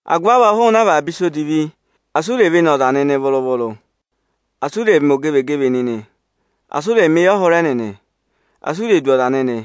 Agụvị avọọ, hụụnị avaba ịsa odivi! Asị u ré vene ọza nịnị vụrụ-vụrụ! Asị ụ rẹ̀ mẹ ogevegeve nịnị! Asị ụ rẹ̀ mẹ eyọhụrẹ nịnị! Asị u rè du ọza nịnị.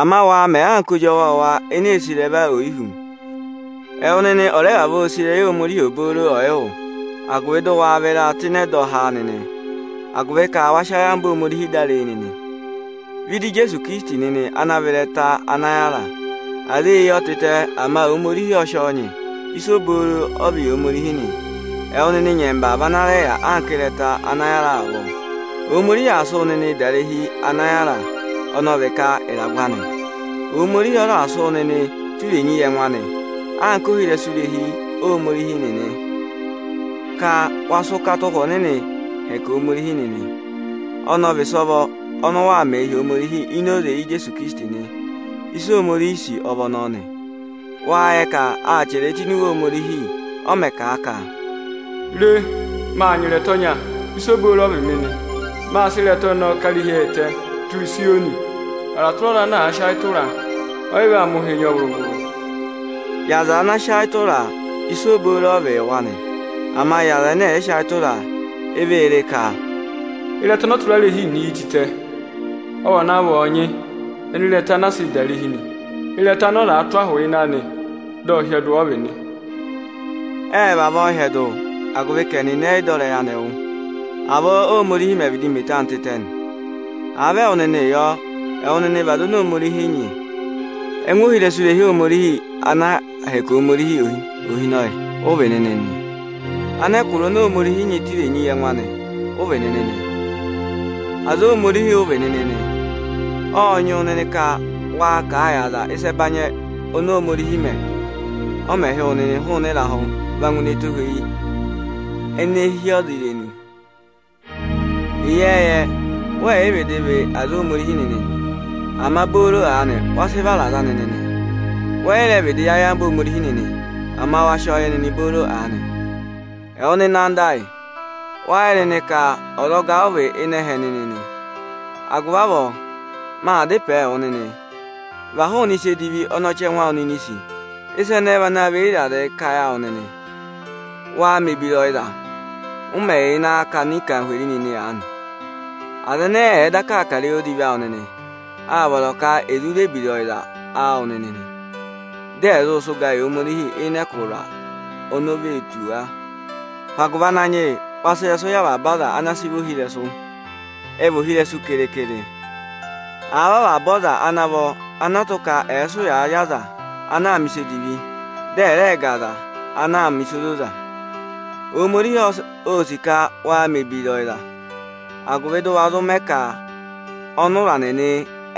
Ama waa mẹ nịnị anka ozi ọwọọwa eneē sì ịrẹva oyi hú. Ẹwụ nịnị ọ̀ rẹ vavọọ sì ịrẹyị Ohomorihi ọ̀yị wụ́, agụvị dị ụ waa vịraa tụ́ ịnị ẹdọha nịnị, agụvị ka wa sị ayamva Ohomorihi dá ree nịnị. Vẹ ịdị Ijeesu Ikirisiti ana vị Ịrẹta ana yára nịnị. Aza ê yi ọ tịtẹ, ama Ohomorihi ọ sị ọ nyị, ịsa obooro ọ vị̀ yị Ohomorihi nị. Ẹwụ nịnị nyẹmba vị ana rẹ yà anka ịrẹta ana yára avọọ. Ohomorihi aa sị wụ nịnịị dà irehi anị ana yára. Ohomorihi ọ raà sị wụ nịnị tụ́ irenyi yị ẹngụ anị anka ohirẹsụ irehi Ohomorihi nịnị, ka wa sị ụkata Ụhwẹ Ọnịnịị hẹkẹ Ohomorihi nịnị. Ọnọọ ọ vị ịsọvọ ọnị waa mẹ̀ ẹ hi Ohomorihi ini oze Ijeesu Ikirisiti nị. Ịsị Ohomorihi sì ọ vị ọnọọ nị. Wáa yẹ ka â chẹrẹ ẹ tụ́ ini Iwe Ohomorihi, ọ mẹ kà a ka, Re, Maa nyị ịrẹta ọnya, ịsa obooro ọ vị mị nị. Mâ sị ịrẹta ọnọọ ká irehi ẹtẹ tụ́ Ịzayọnị. Ọza tụra ọza ana àa sị ayị tụra a, ọ́ yị vaa mẹ ụhịị nyị ọ vụrụ-vụrụ. Yị aza ana sị ayị tụra a, ịsa obooro ọ vị yị wa nị. Ama yị aza ẹnẹ ẹ̀ yị sị ayị tụra a, e vee re ka, ịrẹta ọnị ọtụrarehi nịnị yi tịtẹ, ọ vana vị ọọnyị ịnị ịrẹta ana aā sịị da irehi nị. Ịrẹta ọnị ọzaā tụ́ ahụ ịnị anị dị ọ hyẹdụ ọ vị nị. Ệ vavọọ hyẹdụ, agụvị ka ẹnịnị ẹ́ yị dọ ịrẹyị Ohomorihi wụ. Avọọ Óhomorihi mẹ̀ vịdị mẹ eto anị tịtẹ nị. Àa vị ẹwụ nịnị yọ, ẹwụ nịnị vị aza oni Ohomorihi sị nyị. Ẹngụ ohirẹsụ irehi Ohomorihi ana aa hẹkẹ Ohomorihi Ohinọyị, ụ vị nịnị nị. Anẹkụra oni Ohomorihi nyị tụ́ irenyi yị ẹngụ anị, ụ vị nịnị nị. Aza Ohomorihi obooro ụ vị nịnị nị. Ộ nyị wụ nịnị ka waa kà a yị aza ịsa ẹbanyị-ẹbanyị oni Ohomorihi mẹ, ọ mẹ̀ hị́ wụ nịnị hụụnị ịrahụ va ngụ ini ẹtohweyi anị ene hí ọza irenu. Ịyẹẹyẹ wẹ́ yị vịdị vị aza Ohomorihi nịnị, ama booro aanị wa sị vara aza anị nịnị. Wẹ́ yị rẹ vịdị yẹ ayamva Ohomorihi nịnị, ama wa sị ọ yẹ nịnị booro aanị. Ẹwụ nịnị ọnị mi sì, wâ yẹ nịnị ka ọzọga ụ vị hi ịnị ẹhẹ nịnị nị. Agụvị avọọ, maa dá ịpẹẹ wụ nịnị: Và hụụnị ịsa edivi ọnị ọchẹngụ awụ nịnị sì. Ịsa ẹnẹẹ vị ana và eyi ịrazị kà ayị awụ nịnị. Waa mẹ̀ ebira ọyịza, ụ mẹ yà ịnị akakana anarịmadọwụ nịnị aanị. Aza ẹnẹẹ ẹ̀ẹ daka aa kà ịrẹyị odivi awụ nịnị, áa vọrọ ka è zụ ré ebira ọyịza awụ nịnị, dị ẹ̀ zụ sị ụga yị Ohomorihi ịnị ẹkụhị oni òo ve tù wa. Hụ agụvị Ananyị yị, waa sị ịrẹsụụ yị avaba aza ana a sị vị ohirẹsụ; ẹ̀ẹ vị ohirẹsụ keekere, àa vị avaba aza ana vọ ọnị ọọ̄ tụ́ ka ẹ̀ sị ụya rị aza ana aa mẹ̀ ịsa odivi, dị ẹ rẹẹ ga aza ana aa mẹ̀ ịsa ozoza. Ohomorihi ô sì ka waa mẹ̀ ebira ọyịza, agụvị dị ụ wa zụ mẹ ka ọnụra nịnị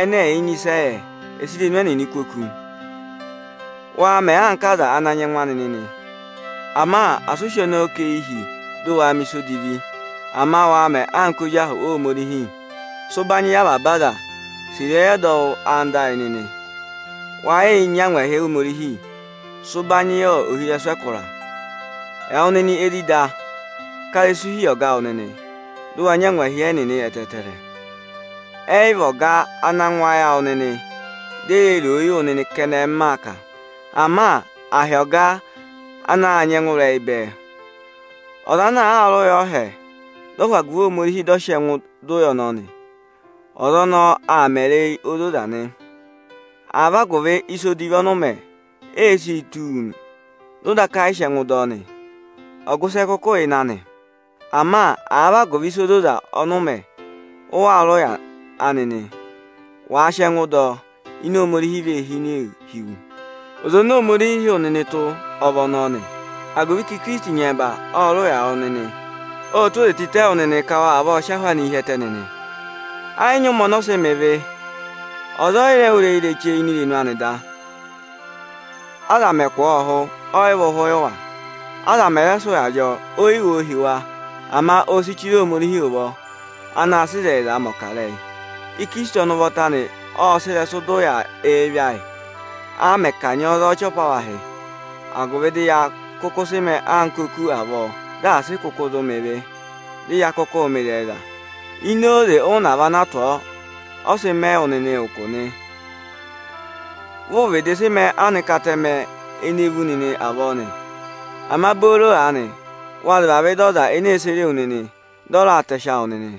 ẹnẹ ẹ̀ yị nyị ịsị ẹ yẹ, ẹ̀ sị irenu ẹnịnị kú oku. Waa mẹ anka aza ana nyị ẹngụ anị nịnị, ama asị ụ sị ọnọọ kà eyi hi, dị ụ waa mẹ̀ ịsa odivi; ama waa mẹ anka ozi ahụ Ohomorihi nịnị. Sị ụbanyị yị avaba aza. Sì ịrẹyị ọdọwụ anda awụ nịnị. We yii hí angwa Ohomorihi nịnị. Sị ụbanyị yị ohirẹsụ ẹkụra nịnị. Ẹwụ nịnị ezida, ká ịrẹsụ hi yị ọga awụ nịnị, dị ụ wa nyị angwahi ẹnịnị ẹtẹẹtẹrẹ. Ẹ́ yị vị ọga anaā ngụ ayị awụ nịnị, dị e ree roo yị wụ nịnị kẹnẹ m maa kà, ama hi ọga anaā nyị ẹngụrẹyị bẹẹ. Ọza aa rị ụya ọọhẹ, dị ọ hụ agụvị Ohomorihi dị ọ sị ẹngụ dọ ụya ọnọọ nị, ọza ọnọọ aa mẹ ịrẹyị ozoza nị. Àa vị agụvị ịsa odivi ọnị ụ mẹ, e si tụ́ wu, dị ụ daka yị sị ẹngụ dọ ọ nị, ọgụ ịsị ẹ kụkụ yà ịnị anị? Ama àa vị agụvị ịsa ozoza ọnị ụ mẹ, ụ waa rị ụya nị, wàa sị ẹngụ dọ ọ, ịnẹ Ohomorihi vee hinee hi wu. Oze oni Ohomorihi hị́ wụ nịnị tụ́ ọ vị ọnọọ nị, agụvị ka Ikirisiti nyẹmba ộ rị ụya yị wụ nịnị. Ộ tụ́ oze tịtẹ yị wụ nịnị ka wa vavọọ sị ahụ anịị hi ẹtẹ nịnị. Ẹ́ yị nyị ụmẹ ọnị ọ sị mẹ ịvị, ọza ộ yị rẹ wụ́ ịrẹyị ireche ini irenu ani da. Aza mẹ̀ kụ̀ ọ́ ụhụ ẹ́ yị và ụhụ yị wa. Aza mẹ̀ raa sị ụyaa rị ọ, ô yi wo hi wa, ama ô si chire Ohomorihi ụvọ, anaā sịị ịzẹyịzaa mẹ̀ ọkarẹyị. Ikirisiti ụvọta ộ sị ịrẹsụ dọ ụya ịvị ayị, a mẹ̀ kanyị ọ za ọchị apavahị, agụvị dị ya kụkụ sị mẹẹ oku avọọ dị asị kụkụ zụ mẹ ịvị, dị ya kụkụụ mẹ ịzẹyịza. Ini oze ụnava ana a tụ̀ ọ, ọ sị mẹ wụ nịnị ụkụ nị. Vị ụ vịdị sị mẹẹ anka atẹmẹ ene vú nịnị avọọ nị, ama booro aanị wa zị vavẹ ịdị Ọza ene ee sere wu nịnị, dị ọ raa tẹsị awụ nịnị.